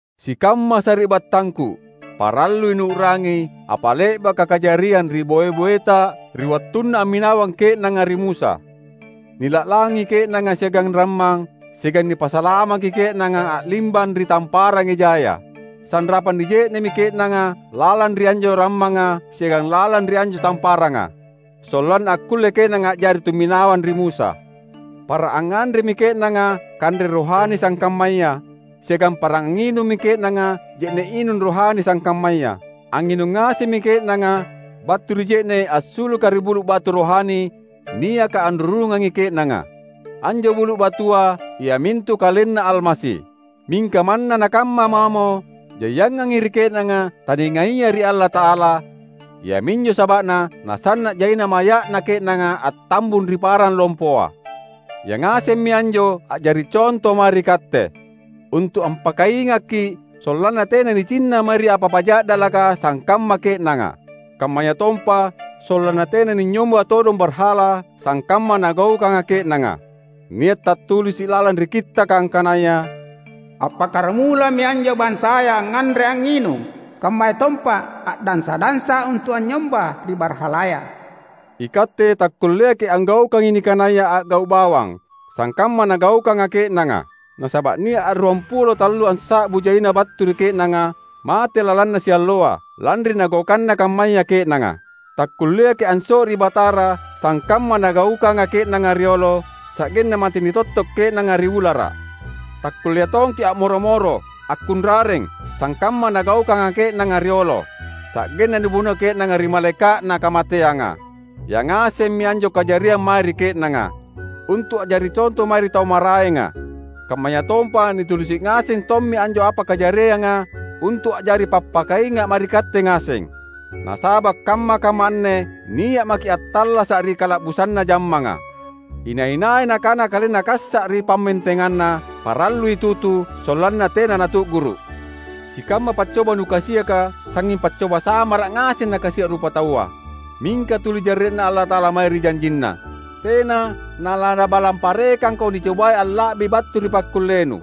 Sikamma sari’battangku! Parallui nuu’rangi apa le’baka kajariang ri boe-boeta ri wattunna amminawang ke’nanga ri Musa. Nila’langi ke’nanga siagang rammang, siagang nipasalamaki ke’nanga a’limbang ri Tamparang Ejaya. Sanrapang nije’ne’mi ke’nanga lalang ri anjo rammanga siagang lalang ri anjo tamparanga, sollanna akkulle ke’nanga a’jari tumminawang ri Musa. Para angnganremi ke’nanga kanre rohani sangkammaya, siagang para angnginummi ke’nanga je’ne’ inung rohani sangkammaya. Angnginung ngasemmi ke’nanga battu ri je’ne’ assuluka ri bulu’ batu rohani niaka anrurungangi ke’nanga; anjo bulu’ batua iamintu KalenNa Almasi. Mingka manna nakamma mamo, jaiangangi ri ke’nanga taningaia ri Allata’ala; iaminjo saba’na nasanna’ jaina maya’na ke’nanga attambung ri parang lompoa. Yangasemmi anjo a’jari conto mae ri katte, untu’ ampakaingakki’ sollanna tena nicinna mae ri apa-apa ja’dalaka sangkamma ke’nanga. Kammayatompa sollanna tena ninynyomba todong barhala sangkamma nagaukanga ke’nanga. Nia’ tattulisi’ lalang ri Kittaka angkanaya, "Appakkaramulami anjo bansaya angnganre angnginung, kammayatompa a’dansa-dansa untu’ anynyomba ri barhalaya." Ikatte takkulleaki’ anggaukangi nikanaya a’gau’ bawang, sangkamma nagaukanga ke’nanga. Nasaba’ nia’ ruampulo antallussa’bu jaina battu ri ke’nanga mate lalanna sialloa, lanri nagaukanna kammaya ke’nanga. Takkulleaki’ anso’ri Batara sangkamma nagaukanga ke’nanga riolo, sa’genna mate nitotto’ ke’nanga ri ulara’. Takkullea tongki’ a’moro-moro, akkunrareng; sangkamma nagaukanga ke’nanga riolo, sa’genna nibuno ke’nanga ri Malaeka’na Kamateanga. Yangasemmi anjo kajariang mae ri ke’nanga, untu’ a’jari conto mae ri tau maraenga. Kammayatompa nitulisi’ ngaseng tommi anjo apa kajarianga untu’ a’jari pappakainga’ mae ri katte ngaseng. Nasaba’ kamma-kamma anne nia’ maki’ attallasa’ ri kala’busanna jammanga. Inai-nai nakana kalenna kassa’ ri pammentenganna, parallui tutu, sollanna tena natu’guru’. Sikamma paccoba nukasiaka, sangnging paccoba samara’ ngaseng nakasia’ rupataua. Mingka tuli jarre’Na Allata’ala mae ri janjinNa. Tena nalaNabalang parekangko nicobai alla’bi battu ri pakkullenu.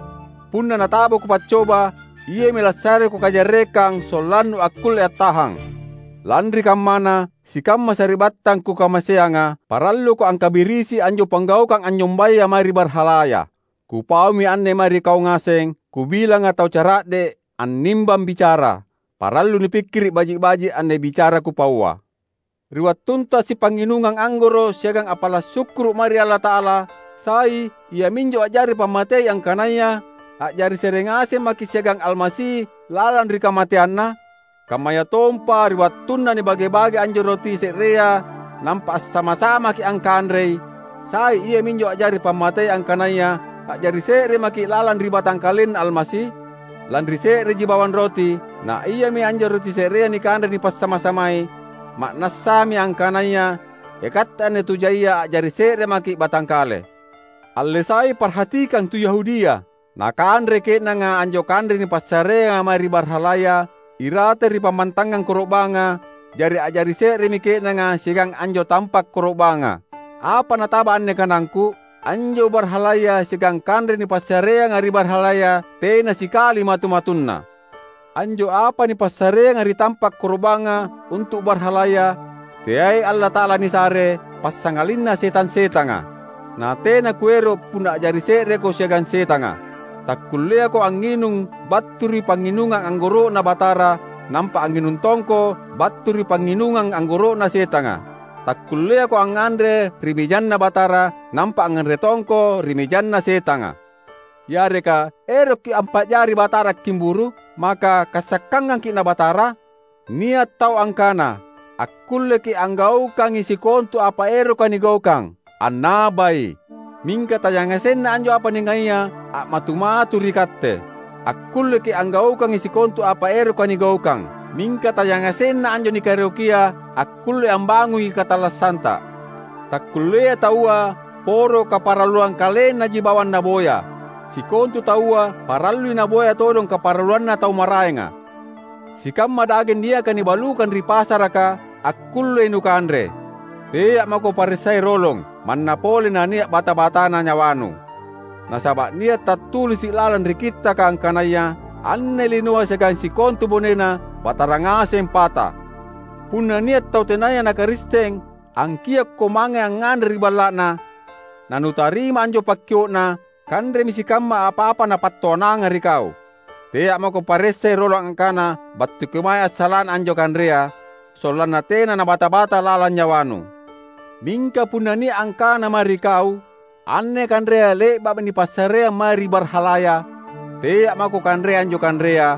Punna natabako paccoba, Iami lassareko kajarrekang sollannu akkulle attahang. Lanri kammana, sikamma sari’battang kukamaseanga, paralluko angkabirisi anjo panggaukang anynyombaya mae ri barhalaya. Kupaumi anne mae ri kau ngaseng, kubilanga tau cara’de’ annimbang bicara. Parallui nupikkiri’ baji’-baji’ anne bicara kupaua. Ri wattunta sipangnginungang anggoro’ siagang appala’ sukkuru’ mae ri Allata’ala, sai iaminjo a’jari pammatei angkanaya a’jari se’re ngaseng maki’ siagang Almasi lalang ri kamateanNa? Kammayatompa ri wattunna nibage-bage anjo roti se’rea nampa assama-samaki’ angkanrei, sai iaminjo a’jari pammatei angkanaya a’jari se’re maki’ lalang ri batangkalenNa Almasi? Lanri se’reji bawang roti, na iami anjo roti se’rea nikanre nipassama-samai, ma’nassami angkanaya ikatte anne tu jaia a’jari se’re maki’ batangkale. Alle sai parhatikang tu Yahudia. Nakanrei ke’nanga anjo kanre nipassareanga mae ri barhalaya irate ri pammantangang koro’banga; jari a’jari se’remi ke’nanga siagang anjo tampa’ koro’banga. Apa nataba anne kanangku? Anjo barhalaya siagang kanre nipassareanga ri barhalaya tena sikali matu-matunna. Anjo apa nipassareanga ri tampa’ koro’banga untu’ barhalaya, teai Allata’ala nisare, passangalinna setang-setanga. Na tena kuero’ punna a’jari se’reko siagang setanga. Takkulleako angnginung battu ri pangnginungang anggoro’Na Batara, nampa angnginung tongko battu ri pangnginungang anggoro’na setanga. Takkulleako angnganre ri mejanNa Batara, nampa angnganre tongko ri mejanna setanga. Yareka erokki’ ampa’jari Batara akkimburu’? Maka kassakangangki’ na Batara? Nia’ tau angkana, "Akkulleki’ anggaukangi sikontu apa eroka nigaukang." Annabai! Mingka tayangasenna anjo apa ningaia a’matu-matu ri katte. "Akkulleki’ anggaukangi sikontu apa eroka nigaukang" — mingka tayangasenna anjo nikaerokia akkulle ambangungi katallassanta. Takkulleai taua poro kaparalluang kalennaji bawang naboya. Sikontu taua parallui naboya todong kaparalluanna tau maraenga. Sikamma dageng niaka nibalukang ri pasaraka akkullei nukanre. Tea’ mako paressai rolong, manna pole nania’ bata-batana nyawanu. Nasaba’ nia’ tattulisi’ lalang ri Kittaka angkanaya, "Anne linoa siagang sikontu bonena, Batara ngaseng pata." Punna nia’ tau tenaya na Karisteng angkiokko mange angnganre ri balla’na, nanutarima anjo pakkio’na, kanremi sikamma apa-apa napattoananga ri kau. Tea’ mako paressai rolong angkana battu kemae assala’na anjo kanrea, sollanna tena nabata-bata lalang nyawanu. Mingka punna nia’ angkana mae ri kau, "Anne kanrea le’ba’mi nipassareang mae ri barhalaya," tea’ mako kanrei anjo kanrea,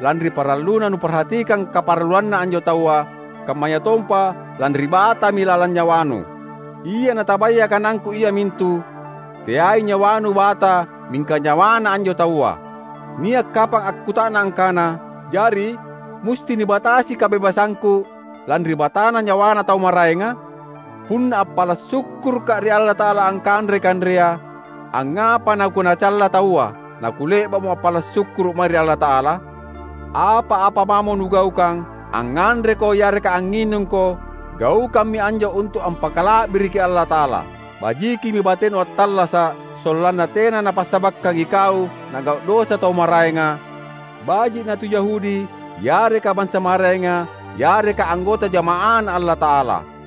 lanri paralluna nuparhatikang kaparalluanna anjo taua, kammayatompa lanri batami lalang nyawanu. Ia natabaya kanangku iamintu, teai nyawanu bata mingka nyawana anjo taua. Nia’ kapang akkuta’nang angkana, "Jari, musti nibatasi kabebasangku lanri batana nyawana tau maraenga? Punna appala’ sukkurukka’ ri Allata’ala angkanrei kanrea, angngapa nakunacalla taua, nakule’ba’mo appala’ sukkuru’ mae ri Allata’ala?" Apa-apa mamo nugaukang — angnganreko yareka angnginungko — gaukammi anjo untu’ ampakala’biriki Allata’ala. Bajikimi batenu attallasa’, sollanna tena napassabakkang ikau na’gau’ dosa tau maraenga; baji’ na tu Yahudi yareka bansa maraenga, yareka anggota jama’aNa Allata’ala.